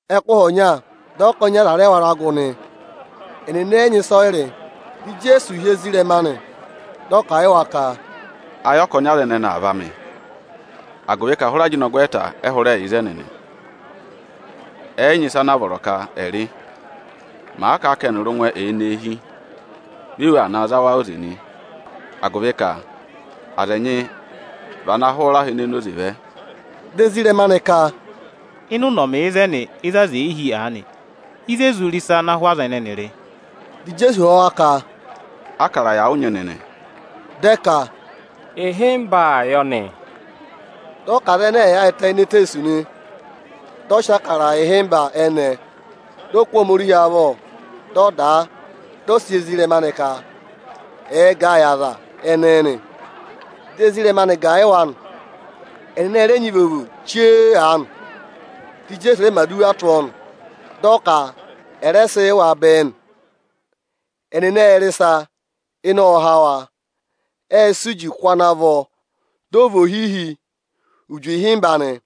Ẹkụhị ọnya dị ọkọnị aza rẹ wara gụ nị. Ẹnịnị ẹ yị nyị ịsọyịrị. Dị Ijeesu hị́ ezirẹma anị, dị ọ kà a yị wa ka: “Ayị ọkọnị aza ẹnẹnị aa vá mị, agụvị ka hụrẹ ajịnọgwẹẹta ẹ hụrẹ yà ịzẹnị nị, ẹ yị nyị ịsa anaa vọrọ ka ẹ̀ rị. Màa kà a ka ẹnịrị ụngwẹ ẹ̀ẹ nọ eehi, vi èwù aa za wa óze nị, agụvị ka aza ẹnyị vị ana hụrẹ aha onoze vẹ.” Dị ezirẹma anị ka, “Ịnị ụnọmị ịzẹnị, ịzị aza è yi hi aanị, ịzị e zụ re ịsa ana hụ aza ẹnẹnị rị?” Dị Ijeesu họ̀ wa ka, “Ákara yà ụ nyị nịnị?” Dị ẹ ka, “Ịhịmba yọ nị.” Dị ọ ka aza ẹnẹẹ ẹ̀ yaayịtẹ ini eteesu nị. Ộ sị Ịbụrẹẹdị ịhịmba ẹnẹẹ, dị ọ kụ́ Ohomorihi avọ, dị ọ dà a, dị ọ sị yị ezirẹma anị ka ẹ̀ gà ẹ yị aza ẹnẹẹ nị. Dị ezirẹma anị gà ẹ yị wa nị. Ẹnịnị ẹ rẹ nyị ivovo chee aanị, dị Ijeesu rẹ mẹ̀ aduwa tụ́ ọọ nị, dị ọ ka à rẹ sị yị wa bẹẹ nị. Ẹnịnị ệ rị ịsa, dị ịnẹ há wa nị. Ệ sị uji kụ́ ana vọ, dị ọ vị ohihi uji ịhịmba nị.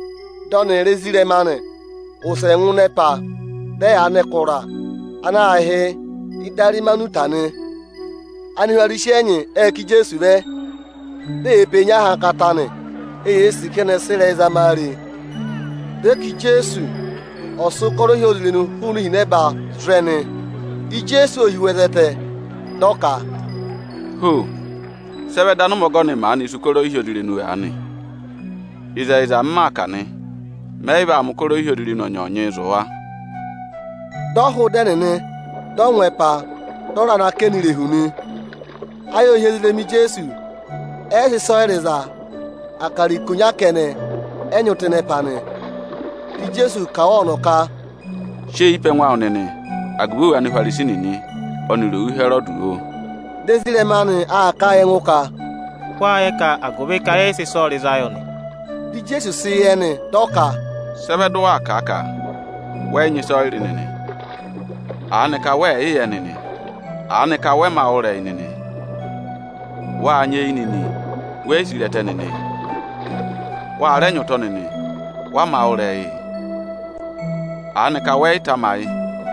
Dị ọnịrị ezirẹma anị wụsẹ ngụ ẹpa, dị ẹyaa nọ ẹkụra ana aā hị́ Idarimanuta nị. Anihwarisi ẹnyị ệ ká Ijeesu vẹ, di eyee pee nyị ahankata nị. Eyee sì ka ẹnị ẹ̀ sị ịrẹyị zama a re. Dị ẹ ka Ijeesu ọ̀ sị ụkọrọ ohyozirenu hụụnị ihinẹba zụ̀ ẹnị nị. Ijeesu ô hi ụhwẹ zẹtẹ, dị ọ ka, “Ho! Sị ẹ vẹ dị anụmẹ ọgọnị maanịị̄ sì ụkọrọ ohyozirenu aanị? Ịzẹyịza, m maa kà nị, mẹ yị vaa mẹ̀ ụkọrọ ohyozirenu ọnyọọnyị zụ̀ wa.” Dị ọ hụụ ịdị ẹnịnị, dị ọ ngụ ẹpa, dị ọ raa nọ akẹnẹ irehu eyi ọsọọ nị. Ayị ô hi ezirẹma Ijeesu, ẹ yị sị ịsọyịrị za. Akara ikonya kẹnẹ ẹ nyị tụ́ ịnị ẹpa nị. Dị Ijeesu kà wa ọnọ ka, “Sị eyi pe ẹngụ awụ nịnị agụvị òwù Anihwarisi nịnị ọnịrị òwù Ịhẹrọdị, oo!” Dị ezirẹma anị aa kà a yị ẹngụ ka, “Wáá yẹ ka agụvị ka yẹ yị sị ịsọyịrị za yọ nị?” Dị Ijeesu sị yẹ nị, dị ọ ka, “Sị ẹ vẹ dị ụ waa kà a ka wẹ yị nyị ịsọyịrị nịnị? Aanịka wẹẹ̀ yị va yị yẹ nịnị? Aanịka wa mā wụ́ ịrẹyị nịnị? Wâ nyị eyi nịnị, we yi si re ẹtẹ nịnịị? Wa rẹ nyị ụtọ nịnị, wa mā wụ́ ịrẹyịị? Aanịka wẹ yị tamayị,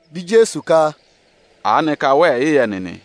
Dị Ijeesu ka, “Aanịka wẹẹ̀ yị yị yẹ nịnị?”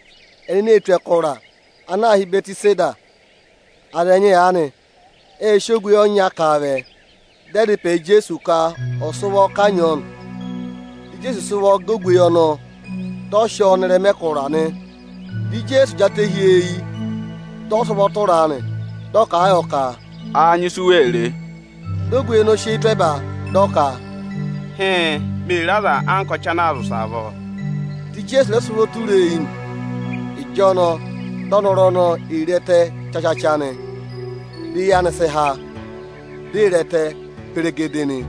Ẹnịnị ê tù ẹkụra ana aā hị́ Ịbẹtịseda. Aza ẹnyị aanị ệ sị ogweyi ọnya ká a vẹ. Dị ẹ dá ịpẹ yị Ijeesu ka ọ̀ sị ụvọ kanyị ọọ nị; Dị Ijeesu sị ụvọ gẹ ogweyi ọnọọ, dị ọ sị ọọ nọ ịrẹma ẹkụra nị. Dị Ijeesu jị atẹ hi ọọ eyi, dị ọ sị ụvọ tụra a nị. Dị ọ kà a yọ ka, “Áá nyị ịsị u wee re?” Dị ogweyi ọnọọ sị eyi tụ́ ẹba, dị ọ ka, “Hịịn, mee re aza anka ọchị anaa zị ụsẹ avọọ.” Dị Ijeesu rẹ sị ụvọ tụra a eyi nị. Ịjọnọọ dị ọnọrụ ọnọọ ee re ẹtẹ chachacha nị, di eyi anị sị há, di ee re ẹtẹ peregedee nị.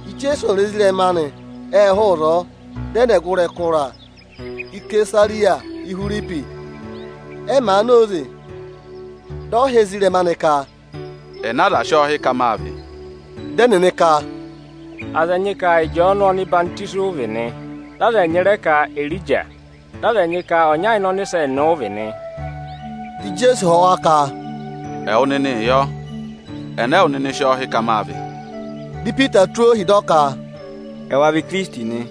Ijeesu ọnịrị ezirẹma anị ệ hụụ ịzọọ, dị ẹ nọ ọgụrị ẹkụra Ịsẹsarịya-Ihwiripi nị. Ẹ màa na óze, dị ọ họ̀ ezirẹma anị ka, “Ẹnẹ aza sị ọọ hí ka mâ vị?” Dị ẹnịnị ka, “Aza ẹnyị ka Ịjọọnụ ọhwọzenyi ụ vị nị. Dị aza ẹnyị rẹ ka Erija; dị aza ẹnyị ka ọnya ịnị ọnịsẹ nịnị ụ vị nị.” Dị Ijeesu họ̀ wa ka, “Ẹwụ nịnịị yọ, ẹnẹ ẹwụ nịnị sị ọọ hị́ ka mâ vị?” Dị Ipita tụ́ ohi, dị ọ ka, “Ẹwa vị Ikirisiti nị”.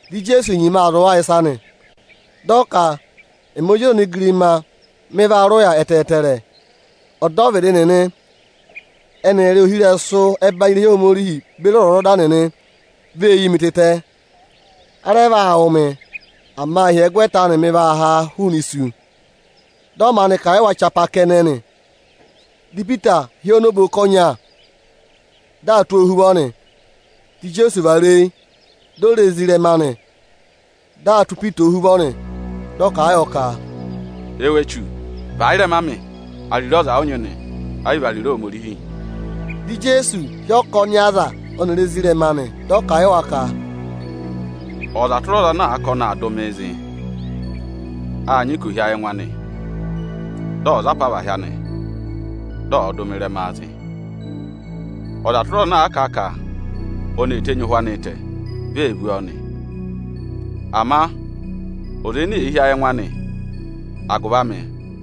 Dị Ijeesu nyima aa zụ̀ wa ịsa nị, dị ọ ka, “Ẹmị Ozi ọza onigirima mị vaa rị ụya ẹtẹẹtẹrẹ. Ọdọvịdị nịnị ẹnịrị ohirẹsụ ọbanyị irehi Ohomorihi nịnị beri ọzwọzọda nịnị vee yi mii tịtẹ. A rẹ vaa wụ̀ mị, ama ịhyẹgwẹta anị mị vaa haa hụụnị isu.” Dị ọ maanị kà a yị wa chapaa kẹnẹ nị. Dị Ipita hị́ ọọ nọ oboka ọnya, dị aa tụ́ ọọ ohuvọ nị. Dị Ijeesu vara eyi, di o re ezirẹma anị, dị aa tụ́ Ipita ohuvọ nị. Dị ọ kà a yọ ka, “Ẹwụ echu, và ị́rẹma amị! Ariro ọza ụ nyị nị, ẹ yị vị ariro Ohomorihi.” Dị Ijeesu hị́ ọkọnị aza ọnịrị ezirẹma anị, dị ọ kà a yị wa ka, “Ọza tụra ọza ana àa ka ọnị aa dụ mịị zị, â nyị ka ò hí ayị ẹngụ anị, dị ọ̀ za apavahị anị, dị ọ̀ọ dụ mị ịrẹmaa zị. Ọza tụra ọza ana àa kà a ka ọnị ee tenyi ụhwẹ anịị tẹ, vi ee vú ọọ nị. Ama ọza ene èe hí ayị ẹngụ anị agụvị amị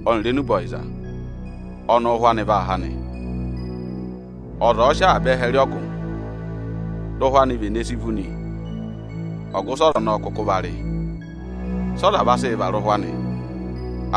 ọnịrị agụvị enube ọyịza, ọnị ụ́hwẹ anị vaa há nị. Ọza ọ̀ọ sị avaba ẹhẹ rị ọgụ, dị ụhwẹ anị vene si vú nị, ọgụ ịsị ọza ọnọọ kụkụ va rị? Sị ọza vaa sịị hị́ ụhwẹ anịị varẹma?